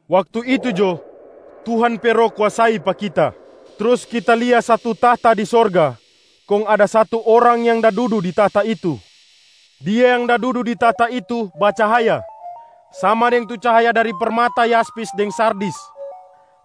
Waktu itu jo, Tuhan pe Roh kuasai pa kita. Trus kita lia satu tahta di sorga, kong ada satu Orang yang da dudu di tahta itu. Dia yang da dudu di tahta itu bacahaya sama deng tu cahaya dari permata yaspis deng sardis,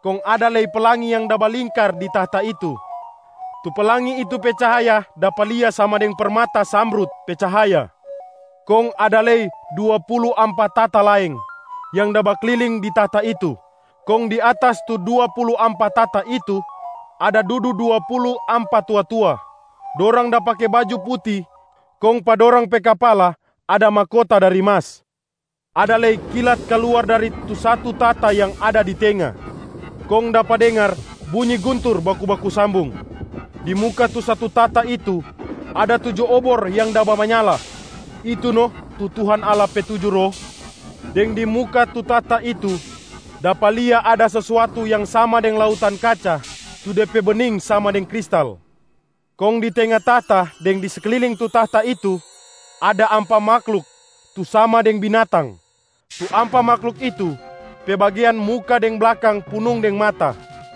kong ada lei pelangi yang da balingkar di tahta itu. Tu pelangi itu pe cahaya dapa lia sama deng permata zamrud pe cahaya. Kong ada lei dua pulu ampa tahta laeng yang da bakliling di tahta itu, kong di atas tu dua pulu ampa tahta itu ada dudu dua pulu ampa tua-tua. Dorang da pake baju puti kong pa dorang pe kapala ada mahkota dari mas. Ada lei kilat kaluar dari tu satu tahta yang ada di tenga, kong dapa dengar bunyi guntur baku-baku sambung. Di muka tu satu tahta itu ada tuju obor yang da bamanyala, itu no tu Tuhan Allah pe tuju Roh. Deng di muka tu tahta itu dapa lia ada sesuatu yang sama deng lautan kaca tu de pe bening sama deng kristal. Kong di tenga tahta deng di sekliling tu tahta itu, ada ampa mahluk tu sama deng binatang. Tu ampa mahluk itu pe bagean muka deng blakang punung deng mata.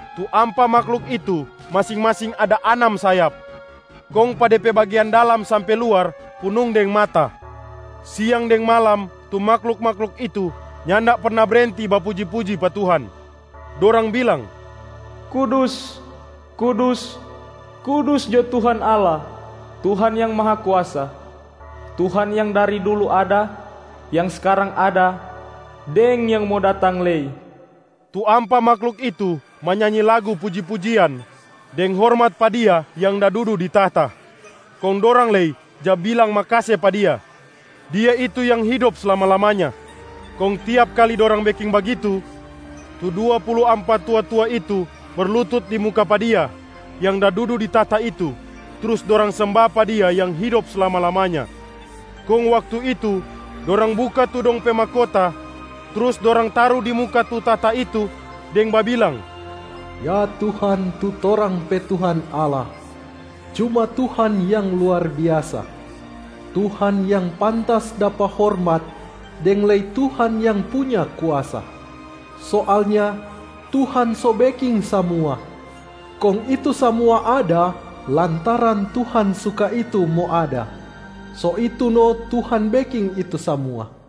Tu ampa mahluk itu masing-masing ada anam sayap, kong pa de pe bagean dalam sampe luar punung deng mata. Siang deng malam tu mahluk-mahluk itu nyanda perna brenti bapuji-puji pa Tuhan. Dorang bilang, “Kudus, kudus, kudus jo Tuhan Allah, Tuhan Yang Mahakuasa. Tuhan yang dari dulu ada, yang skarang ada, deng yang mo datang lei.” Tu ampa mahluk itu manyanyi lagu puji-pujian deng hormat pa Dia yang da dudu di tahta, kong dorang lei ja bilang makase pa Dia. Dia itu yang hidop slama-lamanya. Kong tiap kali dorang beking bagitu, tu dua pulu ampa tua-tua itu berlutut di muka pa Dia yang da dudu di tahta itu trus dorang semba pa Dia yang hidop slama-lamanya. Kong waktu itu, dorang buka tu dong pe mahkota trus dorang taru di muka tu tahta itu deng babilang, “Ya Tuhan tu torang pe Tuhan Allah. Cuma Tuhan yang luar biasa, Tuhan yang pantas dapa hormat, deng lei Tuhan yang punya kuasa! Soalnya Tuhan so beking samua, kong itu samua ada lantaran Tuhan suka itu mo ada, so itu no Tuhan beking itu samua.”